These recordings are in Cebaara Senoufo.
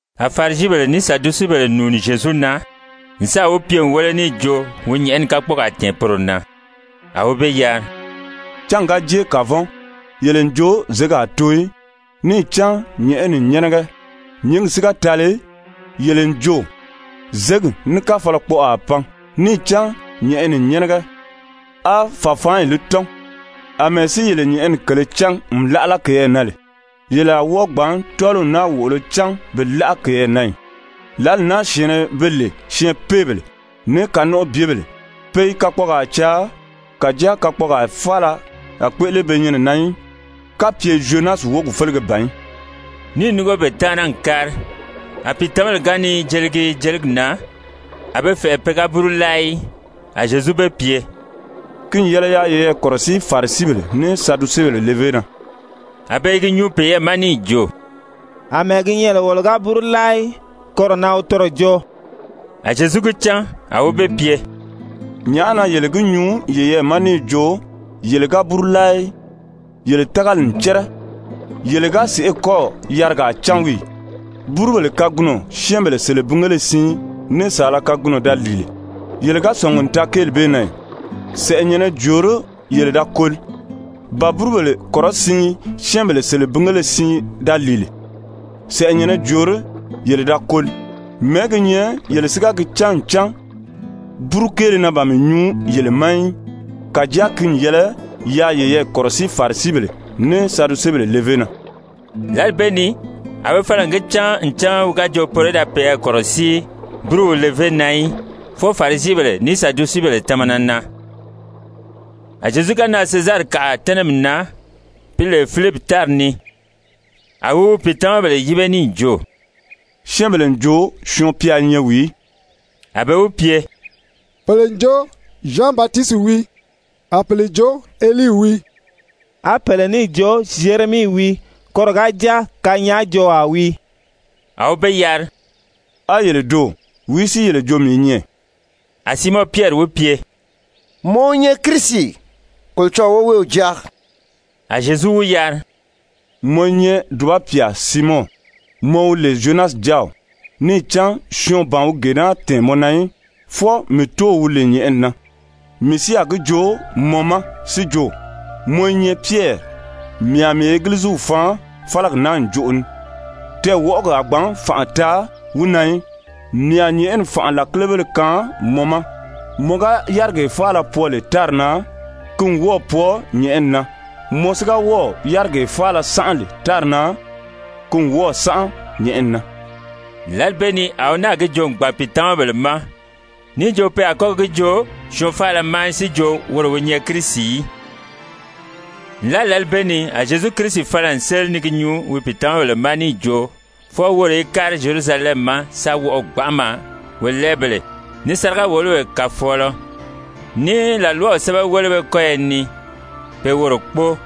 A Farisibèle ní Sadusebèle nùuni Zyezu na n sáà wi pye n wéle níì jo wi nyɛ̀ʔɛni kakpɔɔgaa tɛ̀ɛn poro na. A wi be yari: «[Cángi ga jée kavɔn, yele n jo zěgi a too í, níì cán nyɛ̀ʔɛni n nyɛ́nɛgɛ. Nyǐngi si ga tali, yele n jo zěgi ní káfalakpɔʔɔ a pan, níì cán nyɛ̀ʔɛni n nyɛ́nɛgɛ, á fàfaanyi li tɔ́n. Amɛɛ si yele nyɛ̀ʔɛni kèlē cán n láʔala keyɛɛ na lè, yele a wɔ́ɔ gbǎn tɔ́ɔliw naa wòʔolo cán bi láʔa keyɛɛ na ì?] Lǎli naa syɛ̀ɛnnɛ be lè syɛɛnpeebèle ní kanɔnʔɔbyebèle, pe i kakpɔɔgaa caa, kàjáa kakpɔɔgaa faala a kpéʔele be nyɛnɛ na í kapye Zyonasi wógi félege ban í.» Níì núngo be taana n kári. A pìitamabèle ga ni jeligi jeligi na, a be fɛ̀ʔɛ pe ga búru láa í. A Zyezu be pye: «Ki n yɛlɛ yaa yeyɛɛ kɔ̀rɔsíi Farisibèle ní Sadusebèle levé na.» A be i gi nyuu peyɛɛ ma níì jo: «Amɛɛ gi nyɛ lè wolo ga búru láa í, koro na wi toro jo.» A Zyezu gi cán. A wi be pye: «Nyàʔá na yele gi nyuu yeyɛɛ ma níì jo yele ga búru láa í. Yele tágali n cɛ́rɛ. Yele ga sèʔé kɔ́ɔ̀ yarigaa cán wii ì? Búrubèle kagunɔ syɛ́ɛnbèle selebingéle siin ní saala kagunɔ da lìi lè, yele ga sɔ̀ngi n taa kéeli bee na ì? Sɛ̀ʔɛnyɛ̀nnɛ jòorí yele da koli? Ba búrubèle kɔrɔsiin syɛ́ɛnbèle selebingèle siin da lìi lè, sɛ̀ʔɛnyɛ̀nnɛ jòorí yele da koli? Mɛ̀ɛ́ gi nyɛ yele si ga gi cán ncan búru kéele na ban mii nyuu yele ma í? Kàjáa ki n yɛlɛ yaa yeyɛɛ kɔ̀rɔsíi Farisibèle ní Sadusebèle levé na.» Lǎli bee ni a be fala n gi cán ncan wi ga jo poro í da peyɛɛ kɔ̀rɔsíi búruw levé na í, fwɔɔ Farisibèle ní Sadusebèle tamana na. A Zyezu ga nan Sezarikaʔa tɛ́nɛmi na, pi lè Filipi tári ni, a wi wi pìitamabèle yíbe níì jo: «Syɛ́ɛnbèle n jo Syɔɔn-pya i nyɛ wìí?» A be wi pye: «Pèle n jo, Zyan Batisiti wii. A pèle jo, Elii wii. A pèle níì jo, Zyeremii wii, koro ga jáa kanyaajoowaa wii.» A wi be yari: «A yele doò, wìí si yele jo mii i nyɛ?» A Siimɔn Pyɛri wi pye: «Mɔ wi nyɛ Kirisi, Kolocɔlɔɔ woweew Jáa.» A Zyezu wi yari: «Mɔ i nyɛ dùba pyà, Siimɔn, mɔ wi lè Zyonasi jáaw, níì cán syɔɔn ban wi gee naa tɛ̀ɛn mɔ na í, fwɔɔ mii Tóow wi lè nyɛ̀ʔɛni na. Mii si a gi joo mɔ ma si jo mɔ i nyɛ Pyɛri, mii a mii Egiliziw faan fálagi naa ǹjoʔo ni, tɛɛwɔʔɔgi a gbǎn fànʔa taa wi na í. Mii a nyɛ̀ʔɛni fànʔa làkilebéle kaan mɔ ma. Mɔ ga yárigee faala pwɔɔ lè tári na, ki n wɔ́ɔ̀ pwɔɔ nyɛ̀ʔɛni na. Mɔ si ga wɔ́ɔ̀ yárigee faala sánʔa lè tári na, ki n wɔ́ɔ̀ sánʔa nyɛ̀ʔɛni na.» Lǎli bee ni a wi náà gi joo n gbàn pìitamabèle ma, níì jo pe a kɔ́ gi joo syɔɔn faala ma si jo woro wi nyɛ Kirisi í. Nlaa lǎli bee ni a Zyezu Kirisi fala n séli ni gi nyuu wi pìitamabèle ma níì jo fwɔɔ woro í kári Zyerusalɛmi ma sa wɔʔɔ gbanʔama wolɛɛbèle, ní sáriga-wòlobèle kàfɔɔlɔ, ní làlwaw sɛ́bɛwelebéle kɔ́yɔ ni, pe woro kpóo,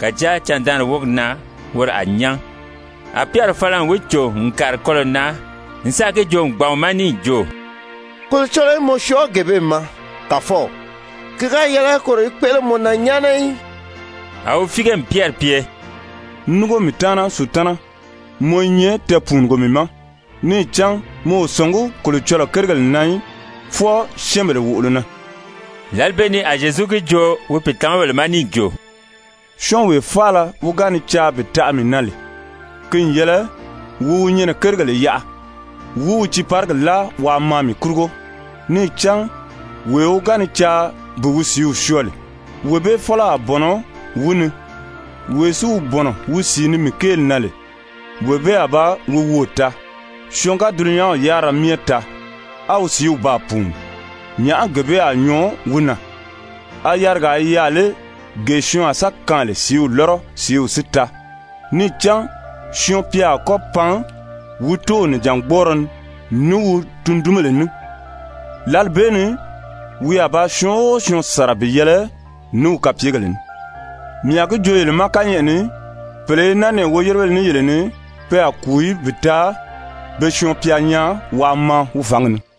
kàjáa candaanri wógi na woro a nyán. A Pyɛri fala n wi cò n kàri kɔlɔ̀ na n sáà gi joo n gbàn wi ma níì jo: «Kolocɔlɔɔ í mɔ syɔɔ gee bee ma, Kàfɔw. Ki ga yɛlɛ koro í kpéʔele mɔ na nyáana í.» A wi fíige n Pyɛri pye: «Núngo mii taana Sutana. Mɔ i nyɛ tɛɛpùunugo mii ma. Níì cán mɔ o sɔ̀ngí Kolocɔlɔɔ kérigèle na í, fwɔɔ syɛ́ɛnbèle wòʔolo na.» Lǎli bee ni a Zyezu gi joo wi pìitamabèle ma níì jo: «Syɔ́ɔnwee faala wi ga ni caa bi taʔa mii na lè, ki n yɛlɛ wi wi nyɛnɛ kérigèle yaʔa wi wi tiiparigi láa waa maa mii kurugo. Níì cán wee wi ga ni caa bi wi sìíw syɔɔ lè, wee bee fɔ́lɔ a bɔ̀nɔ wi ni. Wee si wi bɔ̀nɔ wi sìi ni mii kéeli na lè, wee bee a ba wi woò taa. Syɔɔn ga dulunyanw yárira myɛ taa, á wi sìíw baa pùuni, nyàʔá gee bee a nyɔɔ wi na? A yarigaa i yaà lé gee syɔɔn a sa kaan lè sìíw lɔ́rɔ, sìíw si taa? Níì cán Syɔɔn-pya a kɔ́ pan wi Tóow nìjangbɔɔrɔ ni ní wi tundunbèle ní. Lǎli bee ni wi a ba syɔɔn o syɔɔn sàra bi yɛlɛ ní wi kapyegèle ní. Mii a gi joo yele ma kányɛʔɛ ni, pèle i naa nɛɛ woyérebéle ní yele ni, pe a kùu í bi taa be Syɔɔn-pya nyaa waa maa wi fǎngi ni.»